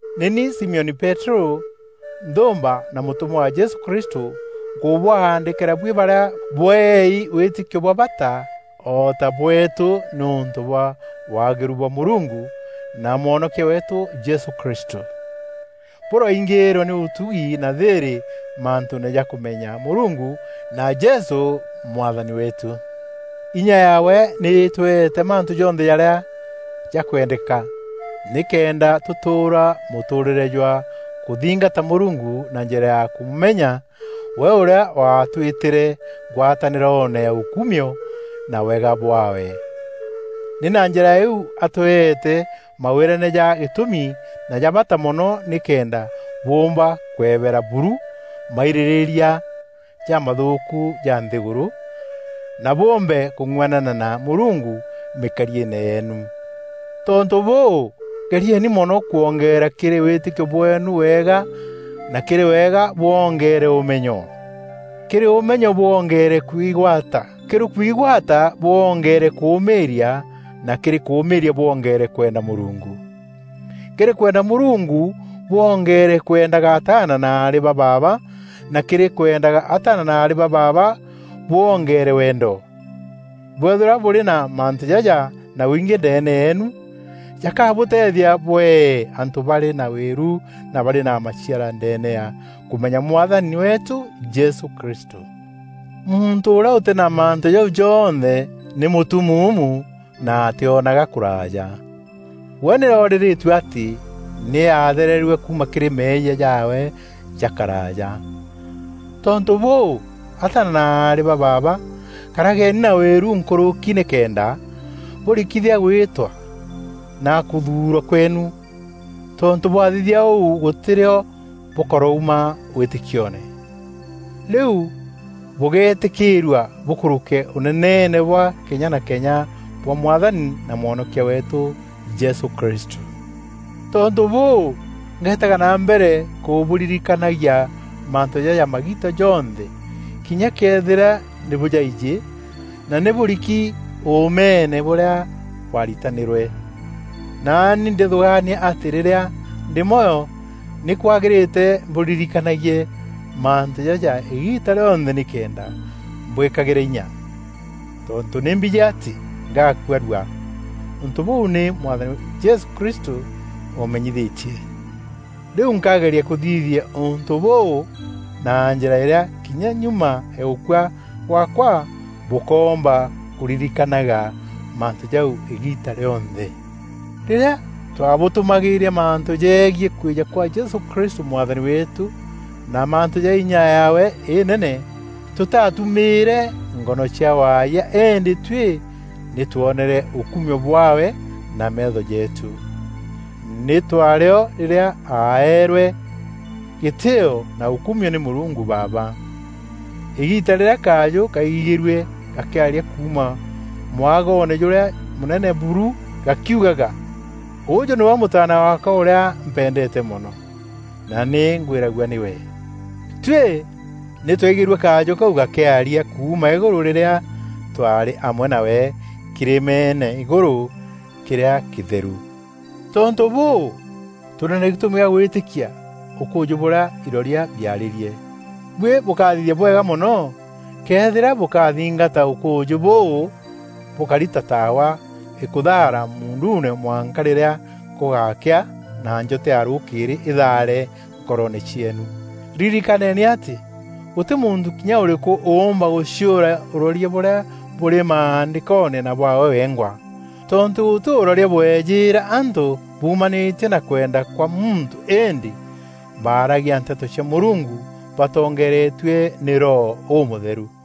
Nî ni Simioni Peterû, nthûûmba na mûtûmwa wa Jesû Kristû, Nkûbwaandîkîra buî barîa bweei wîtîkio bwa bata o ta bweetû nîûntû bwa waagîru bwa Mûrungu, na Mwonokia weetû Jesû Kristû. Bûroingîîrwa nî ûtugi na thîîrî mantûûne ja kûmenya Mûrungu na Jesû Mwathani weetû. Inya yaawe nî îtweete mantû jonthe jarîa jakwendeka nîkenda tûtûûra mûtûûrîre jwa kûthingata Mûrungu na njîra ya kûmûmenya, we ûrîa waatwîtîre ngwatanîroone ya ûkumio na wega bwaawe. Nî na njîra îîu atweete mawîrane ja gîtûmi na ja bata mono nîkenda bûûmba kwebera buru mairîrîîria jamathûûku ja nthîgûrû, na bûmbe kûng'uanana na Mûrungu mîkariîne yeenu. Tontû bûû, gerieni mono kwongeera kîrî wîtîkio bweenu wega na kîrî wega bwongeere ûmenyo; kîrî ûmenyo bwongeere kwigwata; kîrî kwigwata bwongeere kûmîîria na kîrî kûmîîria bwongeere kwenda Mûrungu; kîrî kwenda Mûrungu bwongeere kwendaga ataana na aarî ba baaba na kîrî kwendaga ataana na aarî ba baaba bwongeere wendo. Bwëethîrwa bûrî na mantû jaja na wingî ndeene yeenu, jakabûteethia bwee antû barî na wîru na barî na maciara ndeene ya kûmenya Mwathani weetû Jesû Kristû. Muntû ûrîa ûtî na mantû jau jonthe nî mûtumuumu na atîonaga kûraaja. We nî orîrîtue atî nî aathererue kuuma kîrî meeyia jaawe ja karaaja. Tontû bûû, ataana na aarî ba baaba, karageni na wîru nkûrûki nîkenda bûrikithia gwîtwa na kûthuurwa kweenu. Tontû bwathithia ûu gûtî rîo bûkarouma wîtîkioone. Rîu bûgeetîkîîrua bûkûrûke Ûneneene bwa kenya na kenya bwa Mwathani na Mwonokia weetû Jesû Kristû. Tontû bûû, ngeetaga na mbere kûbûririkanagia mantû jaja magiita jonthe kinya këethîra nî bûjaijî na nî bûriki ûûmeene bûrîa bwaritanîrwe. Naani ndîthûgaania atî rîrîa ndî mwoyo nî kwagîrîte mbûririkanagie mantû jaja îgiita rîonthe nîkenda mbwîkagîre inya. Tontû nî mbijî atî ngakua rua; ûntû bûû nî Mwathani Jesû Kristû ûmenyithîtie. Rîu nkageria kûthithia ûntû bûû na njîra îrîa kinya nyuma ya gûkua gwaakwa, bûkomba kûririkanaga mantû jau îgiita rîonthe. Rîrîa twaabûtûmagîîria mantû jegiî kwîja kwa Jesû Kristû Mwathani weetû na mantû ja inya yaawe înene, tûtatûmîîre ngono cia waayia îndî tuî nî twonere ûkumio bwaawe na meetho jeetû. Nî twaarî o rîrîa aeerwe gîtîîo na ûkumio nî Mûrungu Baaba, îgiita rîrîa kajû kaigîgîrue gakîaria kuuma Mwagoone jûrîa mûnene buru gakiugaga, “Ûûjû nîwe Mûtaana waakwa ûrîa mpendeete mono, na nî ngwîragua nîwe.” Tuî nî twaigîrue kajû kau gakîaria kuuma îgûrû rîrîa twaarî amwe nawe kîrîmeene îgûrû kîrîa kîtheru. Tontû bûû, tûrî na gîtûmi gîa gwîtîkia ûkûûjî bûrîa iroria biaarîrie. Buî bûkathithia bwega mono këethîra bûkathingata ûkûûjî bûu bûkari ta taawa îkûthaara muunduune mwanka rîrîa gûgakea na njota ya rûkîîrî îthaare nkoroone cieenu. Ririkaneni atî, gûtî muntû kinya ûrîkû ûûmba gûciûra ûroria bûrîa bûrî Maandîkoone na bwaawe wengwa. Tontû gûtî ûroria bwejîîra antû bumanîtie na kwenda kwa muntû îndî baaragia nteto cia Mûrungu batongeeretue nî Roho Ûmûtheru.